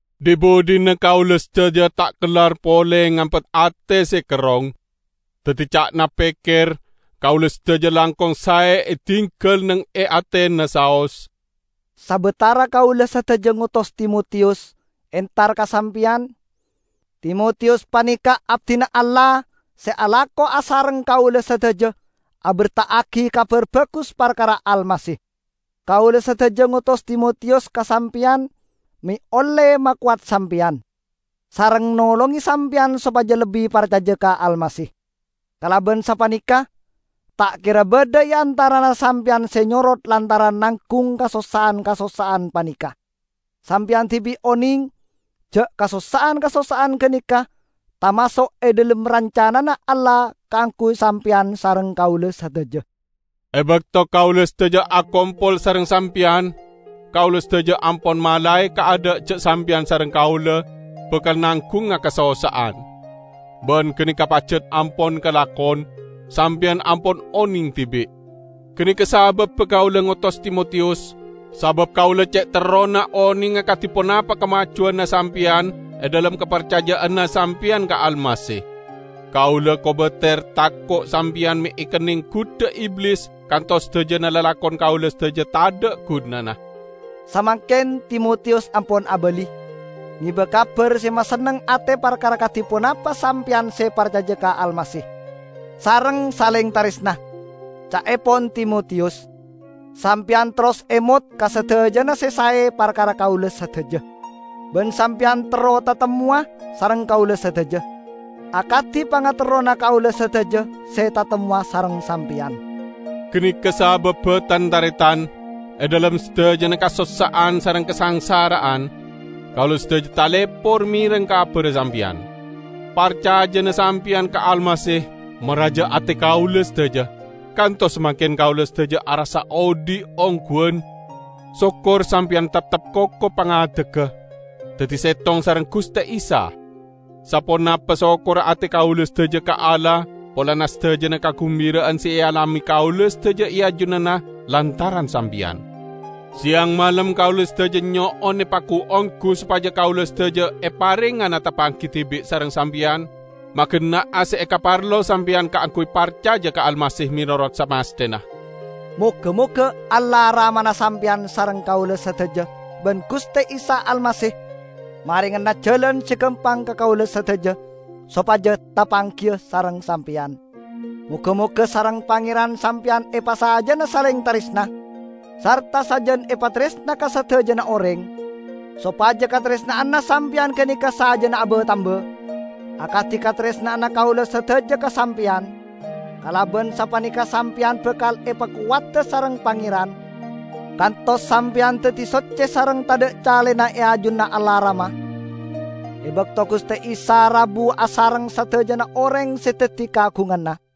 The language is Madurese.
Dhi-budhina kaula sadaja ta' kellar pole ngampet ate se kerrong. Daddi ca'na pekker, kaula sadaja langkong sae edinggal neng e Atena saos, sabatara kaula sadaja ngotos Timotiyus entar ka sampeyan. Timotiyus paneka abdina Allah se alako asareng kaula sadaja aberta'agi Kabar Bagus parkara Almasih. Kaula sadaja ngotos Timotiyus ka sampeyan me' olle makowat sampeyan, sareng nolonge sampeyan sopaja lebbi parcaja ka Almasih. Kalaban sapaneka ta' kera badha e antarana sampeyan se nyorot lantaran nanggung kasossa'an-kasossa'an paneka. Sampeyan dibi' oneng ja' kasossa'an-kasossa'an ganeka tamaso' e dhalem rancanana Allah kaangguy sampeyan sareng kaula sadaja. E bakto kaula sadaja akompol sareng sampeyan, kaula sadaja ampon malae kaadha' ja' sampeyan sareng kaula bakal nanggunga kasossa'an. Ban ganeka pajat ampon kalakon; sampeyan ampon oneng dibi'. Ganeka sababba kaula ngotos Timotiyus, sabab kaula ce' terrona onenga kadi ponapa kamajuwanna sampeyan e dhalem kaparcaja'anna sampeyan ka Almasih. Kaula kobater tako' sampeyan me' ekenneng gudha Iblis kantos sadajana lalakon kaula sadaja tadha' gunana! Samangken Timotiyus ampon abali, ngeba kabar se masenneng ate parkara kadi ponapa sampeyan se parcaja ka Almasih, sareng saleng taresna. Ca'epon Timotiyus sampeyan terros emot ka sadajana se sae parkara kaula sadaja. Ban sampeyan terro tatemmowa sareng kaula sadaja, akadi pangaterrona kaula sadaja se tatemmowa sareng sampeyan. Ganeka sababba, tan-taretan, e dhalem sadajana kasossa'an sareng kasangsara'an, kaula sadaja talepor mereng kabarra sampeyan. Parcajana sampeyan ka Almasih maraja ate kaula sadaja, kantos samangken kaula sadaja arassa odhi' ongguwan, sokor sampeyan teptep koko pangadegga, daddi settong sareng Guste Isa. Saponapa sokkorra ate kaula sadaja ka Allah polana sadajana kagumbira'an se ealame kaula sadaja e ajunanna lantaran sampeyan. Seyang malem kaula sadaja nyo'on epagu-onggu sopaja kaula sadaja eparengngana tapanggi dibi' sareng sampeyan, magenna'a se ekaparlo sampeyan kaangguy parcaja ka Almasih menorot samasthena. Moga-moga Allah Ramana sampeyan sareng kaula sadaja ban Guste Isa Almasih marengana jalan se gampang ka kaula sadaja sopaja tapanggiya sareng sampeyan! Moga-moga sareng Pangeran sampeyan epasajana saleng taresna, sarta sajan epataresna ka sadajana oreng, sopaja kataresna'anna sampeyan ganeka sajana aba-tamba, akadi kataresna'anna kaula sadaja ka sampeyan. Kalaban sapaneka sampeyan bakal epakowada sareng Pangeran, kantos sampeyan daddi socce sareng tadha' calena e ajunanna Allah Rama, e bakto Guste Isa rabu asareng sadajana oreng se daddi kaagunganna.